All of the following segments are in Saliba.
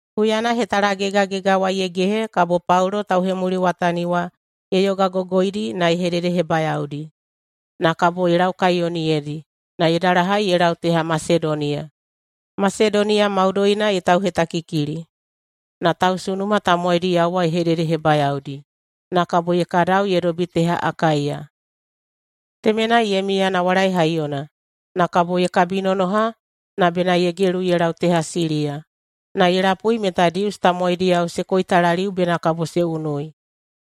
Huyana hetalagegagega wa ye gehe kabo Paulo tauhemuliwatani wa ye yogagogoidi na ye hededehebayaodi, na kabo ye laukaiyoniyedi na ye dalahai ye lau teha Masedoniya. Masedoniya maudoina ye tauhetakikili, na tausunuma tamowaidiyao wa ye hededehebayaodi, na kabo ye kadau ye dobi teha Akaiya. Temenai ye miya nawalai haiyona, na kabo ye kabinonoha na bena ye gelu ye lau teha Siliya. Na ye lapui meta Dius tamowaidiyao se koitalaliu bena kabo se unui,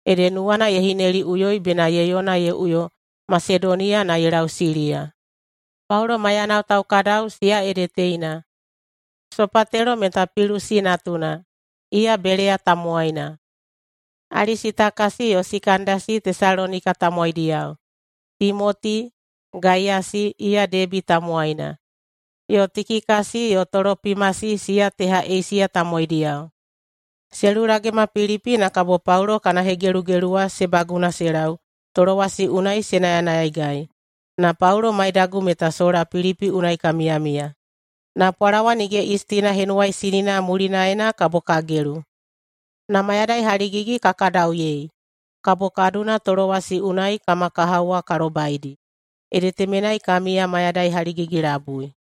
ede nuwana ye hineliꞌuyoi bena ye yona ye uyo Masedoniya na ye lau Siliya. Paulo maiyanao taukadau, siya ede teina: Sopatelo meta Pilusi natuna, iya Beleya tamowaina, Alisitakasi yo Sikandasi Tesalonika tamowaidiyao, Timoti, Gaiyasi, iya Debi tamowaina, yo Tikikasi yo Tolopimasi siya teha Eisiya tamowaidiyao. [Se lulagema Pilipi na kabo Paulo kana hegelugelu wa] se baguna se lau Tolowasi unai se nayanayaigai. Na Paulo maidagu meta sola Pilipi unai ka miyamiya, na Pwalawa Nige Yistina Henuwaisinina mulinaena kabo ka gelu. Na mayadai haligigi ka kadauyei, kabo ka duna Tolowasi unai kama kahao wa ka lobaidi, ede temenai ka miya mayadai haligigi-labui.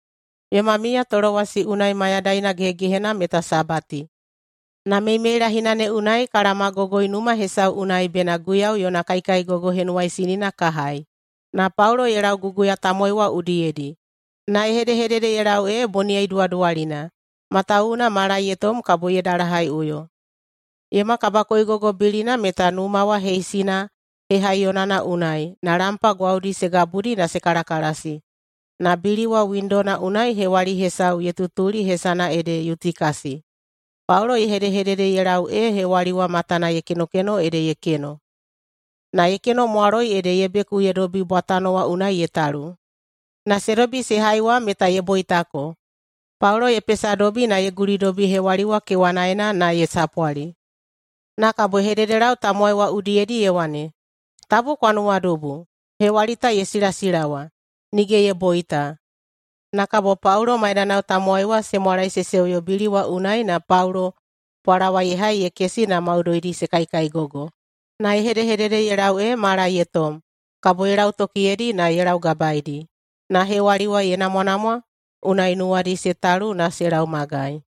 Yoma miya Tolowasi unai mayadaina gehegehenana meta Sabati, na meimeilahina ne unai ka laomagogoi numa hesau unai bena Guiyau yona kaikaigogo henuwaisinina ka hai. Na Paulo ye lauguguya tamowai wa udiyedi, na ye hedehedede ye lau ee boniyai duwaduwalina, matawuwuna mala ye tom kabo ye dalahaiꞌuyo. Yoma kabakoigogo bilina meta numa wa heisina hehaiyonana unai, na lampa gwaudi se gabudi na se kalakalasi. Na bili wa windona unai hewali hesau ye tutuli hesana ede Yutikasi. Paulo ye hedehedede ye lau ee hewali wa matana ye kenokeno ede ye keno. Na ye kenomwaloi ede ye beku ye dobi bwatano wa unai ye talu. Na se dobi se hai wa meta ye boitako. Paulo ye pesadobi na ye gulidobi hewali wa kewanaena na ye sapwali, na kabo ye hededelau tamowai wa udiyedi ye wane, “Tabu kwa nuwadubu! Hewali ta ye silasilawa, nige ye boita.” Na kabo Paulo maidanao tamowai wa se mwalae se seuyo bili wa unai na Paulo pwalawa ye hai ye kesi na maudoidi se kaikaigogo. Na ye hedehedede ye lau ee mala ye tom. Kabo ye lautokiyeidi na ye laugabaedi. Na hewali wa ye namwanamwa, unai nuwadi se talu na se lau magai.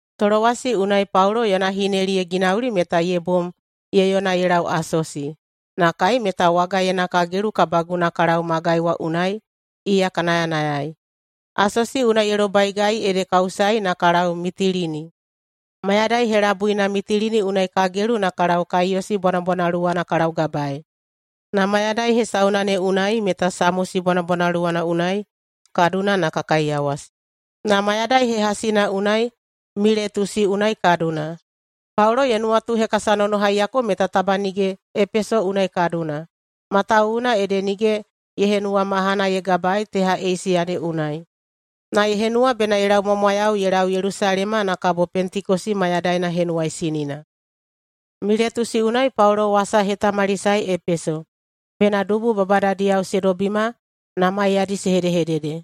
Tolowasi unai Paulo yona hineli ye ginauli meta ye bom ye yona ye lau Asosi, na kai meta wagaena ka gelu ka baguna ka lau magai wa unai iya ka nayanayai. Asosi unai ye lobaigai ede ka usaei na ka lau Mitilini. Mayadai helabuina Mitilini unai ka gelu na ka lau Kaiyosi bwanabwanaluwana ka laugabaei, na mayadai hesauna ne unai meta Samosi bwanabwanaluwana unai ka duna na ka kaiyawasi. Na mayadai hehasina unai Miletusi unai ka duna. Paulo ye nuwatuhekasanonohaiyako meta taba nige Epeso unai ka duna, matawuwuna ede nige ye henuwa mahana ye gabaei teha Eisiya ne unai, na ye henuwa bena ye laumwamwayau ye lau Yelusalema na kabo Pentekosi mayadaina henuwaisinina. Miletusi unai Paulo wasa ye hetamalisaei Epeso, bena dubu babadadiyao se dobima na maiyadi se hedehedede.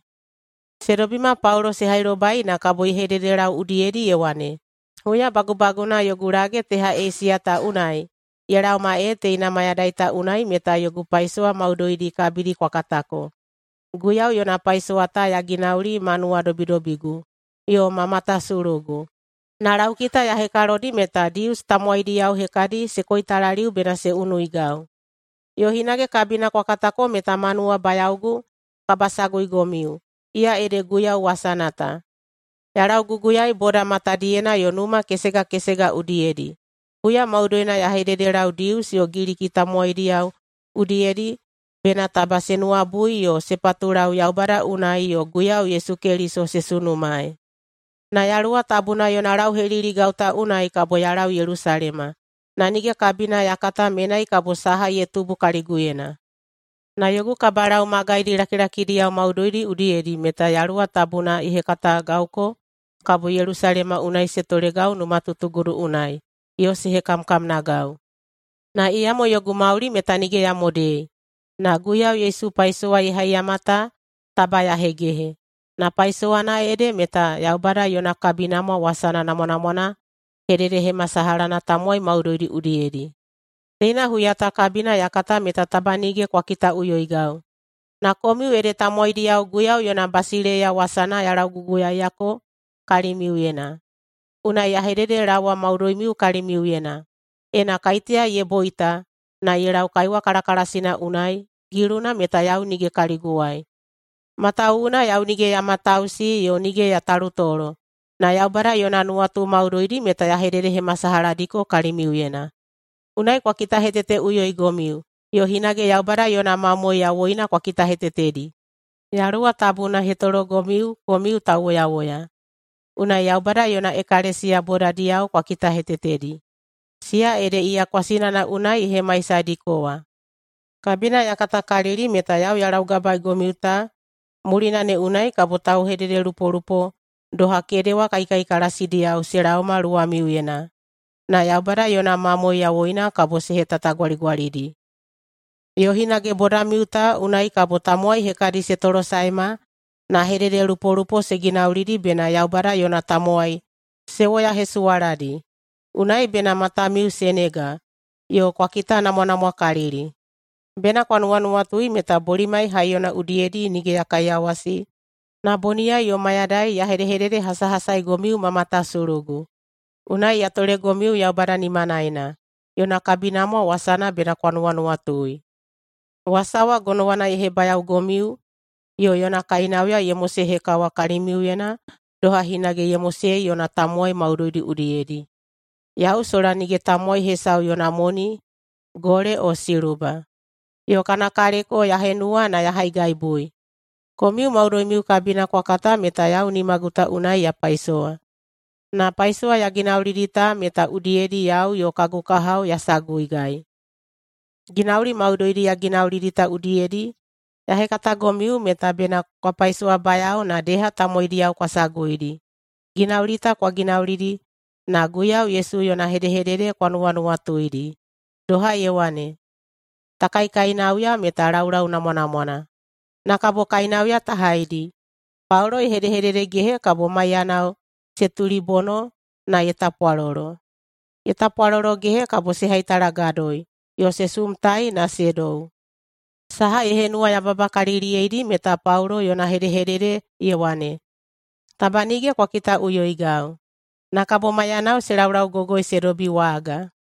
Se dobima Paulo se hailobai na kabo ye hededelau udiyedi ye wane, “Huya bagubaguna yogu lage teha Eisiya ta unai ye laoma ee teina mayadai ta unai meta yogu paisowa maudoidi kabidi kwa katako. Guiyau yona paisowa ta ya ginauli ma nuwadobidobigu yo ma matasulugu. Na laukita ya hekalodi meta Dius tamowaidiyao hekadi se koitalaliu bena se unuigau. Yo hinage kabina kwa katako meta ma nuwabayaogu kabasaguigomiu, iya ede Guiyau wasana ta, ya lauguguyaei boda matadiyena yo numa kesega kesega udiyedi. Huya maudoina ya hededelau Dius yo Giliki tamowaidiyao udiyedi bena taba se nuwabui yo se patulau Yaubada unai yo Guiyau Yesu Keliso se sunumaei. Na Yaluwa Tabuna yona lauheliligau ta unai kabo ya lau Yelusalema, na nige kabina ya kata menai kabo saha ye tubu kaliguyena. Na yogu kabalau magaidi lakilakidiyao maudoidi udiyedi meta Yaluwa Tabuna ye hekatagauko kabo Yelusalema unai se tolegau numatutugudu unai yo se hekamkamnagau. Na iyamo yogu mauli meta nige ya modei, na Guiyau Yesu paisowa ye haiyama ta taba ya hegehe. Na paisowana ede meta Yaubada yona kabinamwa wasana namwanamwana hededehemasalahana tamowai maudoidi udiyedi. Teina huya ta kabina ya kata meta taba nige kwa kitaꞌuyoigau, na komiu ede tamowaidiyao Guiyau yona basileiya wasana ya lauguguyaeiyako kalimiuyena. Unai ya hededelaowa maudoimiu kalimiuyena: Ena kaiteya ye boita na ye lau kaiwa kalakalasina unai, giluna meta yau nige kaliguwai, matawuwuna yau nige ya matausi yo nige ya talutolo, na Yaubada yona nuwatu maudoidi meta ya hededehemasalahadiko kalimiuyena. Unai kwa kitaheteteꞌuyoigomiu yo hinage Yaubada yona mamoe yawoina kwa kitahetetedi. Yaluwa Tabuna ye hetologomiu komiu tauwoyawoya, unai Yaubada yona ekalesiya bodadiyao kwa kitahetetedi, siya ede iya kwasinana unai ye hemaisadiko wa. Kabina ya katakalili meta yau ya laugabaeigomiu ta mulina ne unai kabo taulauhekatalupolupo doha kedewa kaikaikalasidiyao se laoma luwamiuyena, na Yaubada yona mamoe yawoina kabo se hetatagwaligwalidi. Yo hinage bodamiu ta unai kabo tamowai hekadi se tolosaema na hedehededelupolupo se ginaulidi bena Yaubada yona tamowai se woyahesuwaladi. Unai bena matamiu se nega yo kwa kitanamwanamwakalili! Bena kwa nuwanuwatui meta bolimai haiyona udiyedi nige ya kaiyawasi na boniyai yo mayadai ya hedehededehasahasaigomiu ma matasulugu. Unai ya tolegomiu Yaubada nimanaena. Yona kabinamwa wasana bena kwa nuwanuwatui. Wasa wa gonowana ye hebayaogomiu yo yona kainauya ye mosehekawa kalimiuyena doha hinage ye mosei yona tamowai maudoidi udiyedi. Yau sola nige tamowai hesau yona moni gole o siluba, yo kana kaleko ya henuwa na ya haigaibui. Komiu maudoimiu kabina kwa kata meta yau nimagu ta unai ya paisowa, na paisowa ya ginaulidi ta meta udiyedi yau yo kagu kahao ya saguigai. Ginauli maudoidi ya ginaulidi ta udiyedi ya hekatagomiu meta bena kwa paisowabayao na deha tamowaidiyao kwa saguidi. Ginauli ta kwa ginaulidi na Guiyau Yesu yona hedehedede kwa nuwanuwatuidi, doha ye wane, ‘Ta kaikainauya meta laulau namwanamwana, na kabo kainauya ta haidi.’” Paulo ye hedehededegehe kabo maiyanao se tulibono na ye tapwalolo. Ye tapwalologehe kabo se haitalagadoi yo se sumtai na se dou. Saha ye henuwayababakaliliyeidi meta Paulo yona hedehedede ye wane, “Taba nige kwa kitaꞌuyoigau.” Na kabo maiyanao se laulaugogoi se dobi waga.